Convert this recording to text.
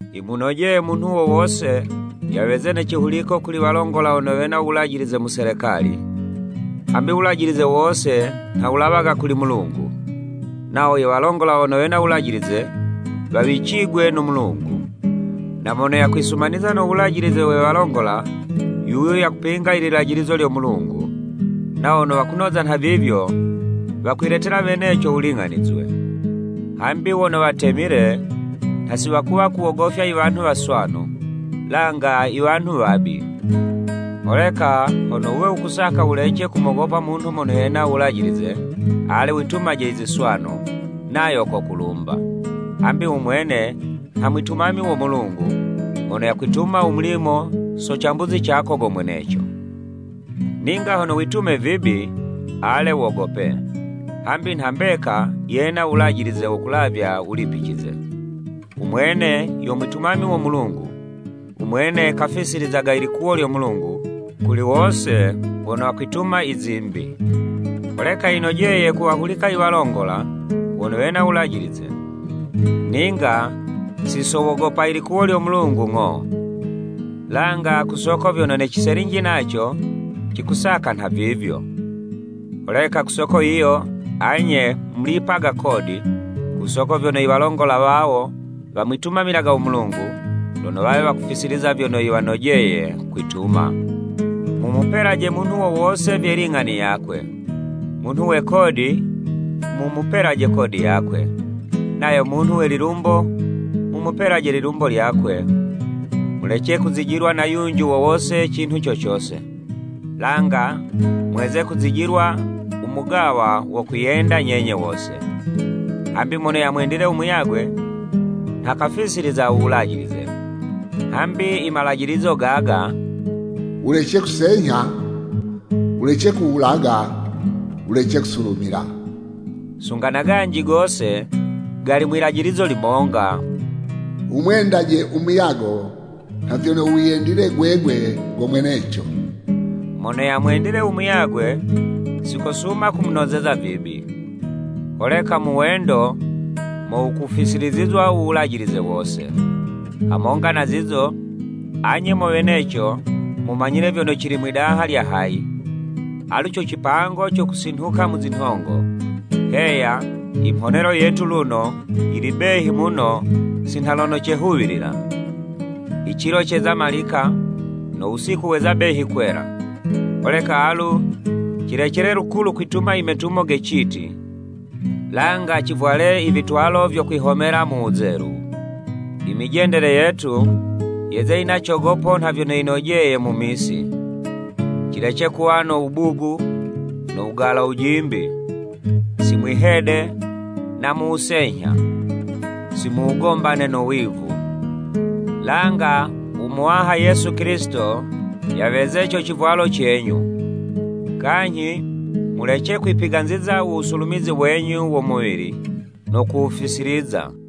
Yimunojeye munhu wo wose, yaweze ne cihuliko kuli walongola wono wena u wulajilize mu Selekali, hambi u wulajilize wose nha wulawaga kuli Mulungu, nawo iwalongola wono wena uwulajilize, wawicigwe no Mulungu. Na mono yakwisumaniza no wulajilize we walongola, yuyo yakupinga ililajilizo lyo Mulungu, nawo wono wakunoza nhavivyo, wakwiletela weneco wuling'anizwe. Hambi wono watemile, nha si wakuwa kuwogofya iwanhu waswanu, langa iwanhu wabi. Holeka hono wuwe wukusaka wulece kumogopa munhu mono yena u wulajilize? Ale witumaje iziswanu, nayo kokulumba, hambi u mwene nha mwitumami wo Mulungu, mono yakwituma u mulimo so cambuzi cako go mweneco. Ninga hono witume vibi, ale wogope, hambi nha mbeka, yena uwulajilize wo kulavya wulipicize. U mwene yo mwitumami wo Mulungu, umwene kalifisilizaga i likuwo lyo Mulungu, kuli wose wono wakwituma izimbi. Holeka yinojeye kuwahulika iwalongola, wono wena u wulajilize, ninga si so wogopa ilikuwo lyo Mulungu ng'o, langa ku soko vyono ne ciselinji naco, cikusaka nhavivyo. Holeka ku soko yiyo anye mulipaga kodi, ku soko vyono i walongola wawo, wamwitumamilaga u Mulungu, lono wawe wakufisiliza vyono yiwanojeye kwituma. Mumupelaje munhu wo wose vye ling'ani yakwe, munhu we kodi, mu mupelaje kodi yakwe, nayo munhu we lilumbo mumupelaje lilumbo, lyakwe. Mulece kuzijilwa na yunji wo wose cinhu co cose, langa mweze kuzijilwa u mugawa wo kwiyenda nyenye wose. Hambi mono yamwendile u muyagwe, nha kafisiliza u wulajilize. Hambi imalajilizo gaga, “Wulece kusenyha, wulece kuwulaga, Wulece kusulumila,” sunga na ganji gose, gali mwilajilizo limonga, “Wumwendaje u muyago nha vyono wiyendile gwegwe go mweneco.” Mono yamwendile u muyagwe, si kosuma kumunozeza vibi. Holeka mu wendo, mo wukufisilizizwa u wulajilize wose. Hamonga na zizo, anye mo weneco, mumanyile vyono cili mwidaha lya hayi, alu co cipango co kusinhuka mu zinhongo, heya, imhonelo yetu luno, yili behi muno si nha lono cehuwilila. Icilo ceza malika, no wusiku weza behi kwela, Holeka alu, cilecele lukulu kwituma imetumo ge citi, langa civwale ivitwalo vyo kwihomela mu wuzelu. I mijendele yetu, yeze yina cogopo nha vyono yinojeye mu misi, cilece kuwa no wubugu no wugala wujimbi, si mwi'hede na mu wusenyha, si mu wugombane no wivu. Langa u Muwaha Yesu Kilisito yaweze co civwalo cenyu, kanyhi mulece kwipiganziza u wusulumizi wenyu wo muwili, no kuwufisiliza.